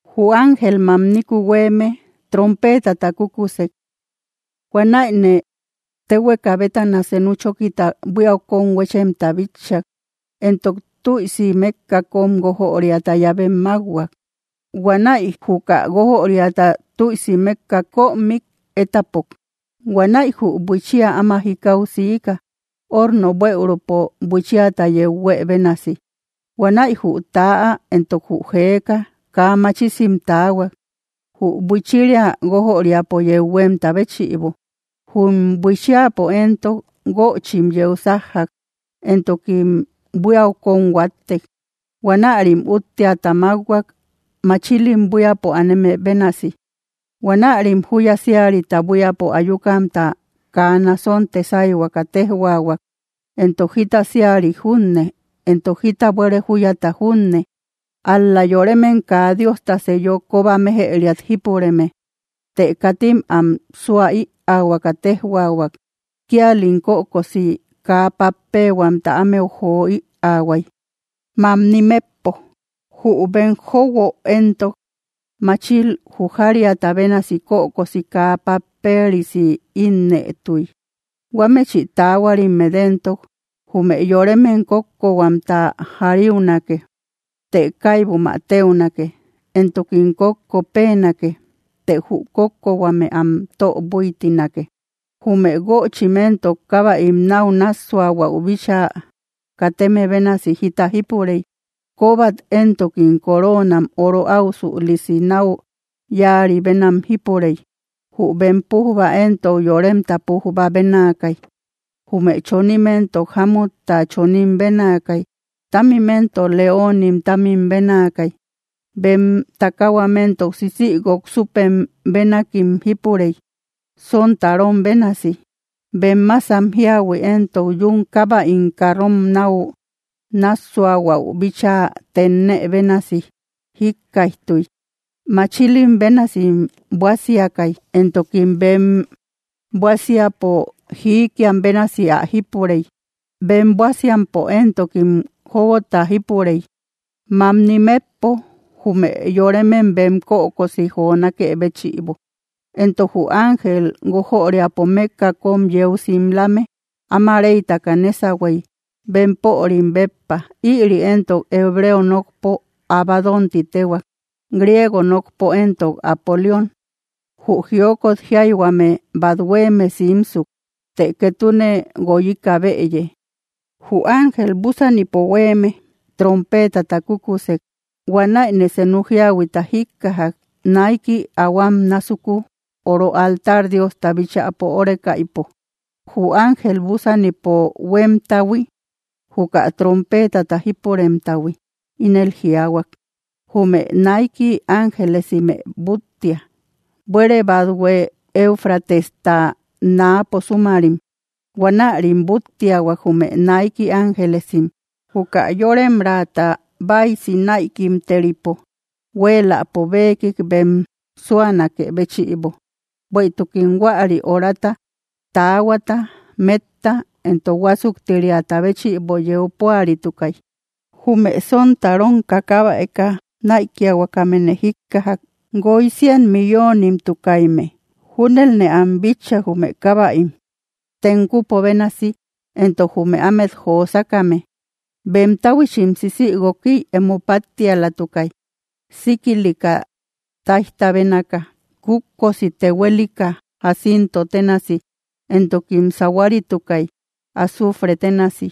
Jü ángel mamniku huéeme trompeetata kúkusek. Huanäine téhueka bétana senu chókita buíau kón huéchemta bitchak. Entok tüisi mékka kóm guójöriata llavem mákhuak. Huanäi juka guójöriata tüisi mékkak kömik étapok. Huanäi jü buiichia áma jikau siika, orno bueürupo buichiata yeu huë bénasi. Huanäi jü täa entok jü jeeka kaa machisim taahuak, jü buichiria guójöriapo yeu huémta béchïbo. Jum buichiapo éntok, guöchim yeu sájjak, entokim buíau kón huáttek. Huanärim útteata mákhuak, machilim buíapo aneme bénasi. Huanärim júya síarita buíapo ayukamta kaa nasonte sáyhuaka téjhuaahuak, entok jita síarik junne, entok jita buére júyata junne, ál‑la yoremem kaa Diosta seello kóba méjëriat jípureme. Të katim am súa ïaahuaka téjhuaahuak; kíalim kökosi kaa pappehuamta ámeu joö ïaahuay, mamni metpo. Jü bem jóuguo éntok, machil jujariata bénasi kökosi kaa papperisi ínnëtuy. Huámechï taahuarimmet éntok, jume yoremem kókkohuamta jariunake, të kaibum ä téunake. Entokim kókko péenake, të jü kókkohuame am tö búitinake. Jume guöchim éntok, kábäim náu nássuahuäu bíchaa kateme bénasi jita jípurey. Kóbat éntokim coroonam oro áusülisi náu yáari bénam jípurey. Jü bem pújba éntok, yoremta pújba bénaakay. Jume chonim éntok, jámutta chomin bénaakay. Támim éntok, leoonim támim bénaakay. Bem takahuam éntok sisïguok súpem bénakim jípurey, sontarom bénasi. Bem másam jíahui éntok yún kábäim carrom náu nássuahuäu bíchaa tennë bénasi jíkkaijtuy. Machilim bénasim buásiakay, entokim bem buásiapo jiikiam bénasi ä jípurey. Bem buásiampo éntokim jóguota jípurey, mamni metpo jume yoremem bem kökosi jonákë béchïbo. Entok jü ángel guójöriapo mékka kóm yeu simlame áma reytaka nésahuey, bempörim béppa. Ïri éntok hebreo nokpo Abadón ti téhuak; griego nokpo éntok, Apolión. Jü jiokot jiayhuame bát huéeme simsuk, të ketune guoyika bëye. Jü ángel búsanipo huéeme trompeetata kúkusek. Huanäine senu jíahuita jíkkajak, naiki ahuám násuku oro altar Diosta bíchäpo órekaïpo. Jü ángel búsanipo huémtahui, juka trompeetata jípuremtahui, ínel jiaahuak: —Jume naiki ángelesimë búttia, buére bathue Eufratesta náapo súmarim. Huanärim búttiahuak, jume naiki ángelesim, juka yóremraata báisi näikimteripo huéeläpo bekik bem súanakë béchïbo, bueïtukim huäri horata, taahuata, metta, entok huásuktiriata béchïbo yeu púaritukay. Jume sontarom kákabäeka näikiahuakamene jíkkajak. Guoy cien milloonimtukayme. Júnelne am bitchak, jume kábäim, tenkupo bénasi, entok jume ámet josakame: Bem táhuichim sisïguokiy emo páttialatukay, síkilika táijta bénaaka, kútkosi tehuelika jacinto ténasi, entokim sahuaritukay, azufre ténasi.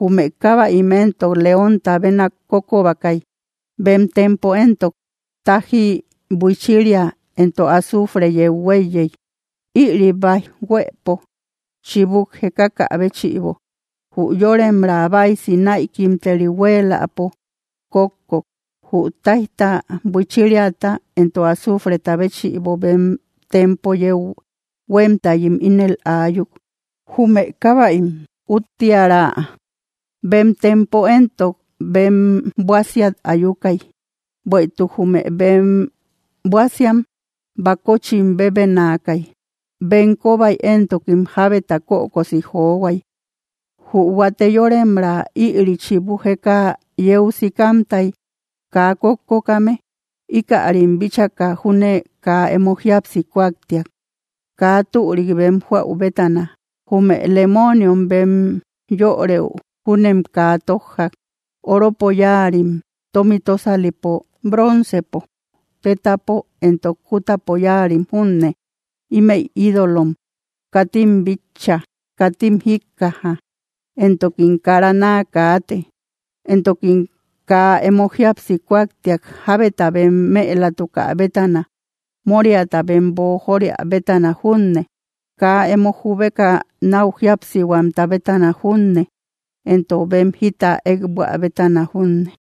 Jume kábäim éntok, leónta bénak kókobakay. Bem tempo éntok, tájji, buichiria, entok azufre yeu huéiyey. Ïri báij huëpo chibuk jekakä béchïbo, jü yóremraa báisi näikimteri huéeläpo kókkok, jü táijta, buichiriata entok azufreta béchïbo; bem tempo yeu huémtayim ínel aayuk. Jume kábäim úttiära bem tempo entok bem buásiat ayukay, bueïtuk jume bem buásiam bakochim bébenaakay. Bem kóbay éntokim jábeta kökosi johuay. Jü huate yóremraa, ïri chibu jeka yeu sikamtay kaa kókkokame, íkärim bíchaka júne kaa emo jíapsi kuaktiak, kaa türik bem joäu bétana. Jume lemooniom bem yörëu júnem kaa tójjak, oropo yáarim, tómi tósalipo, broncepo, tétapo entok kútapo yáarim junne. Ímëi ídolom; katim bitcha, katim jíkkaja, entokim kara naa kaate. Entokim kaa emo jíapsi kuaktiak, jábeta bem mëlatukä bétana, móriata bem boojoria bétana junne, kaa emo jubeka náu jíapsihuamta bétana junne, entok bem jita ékbuä bétana junne.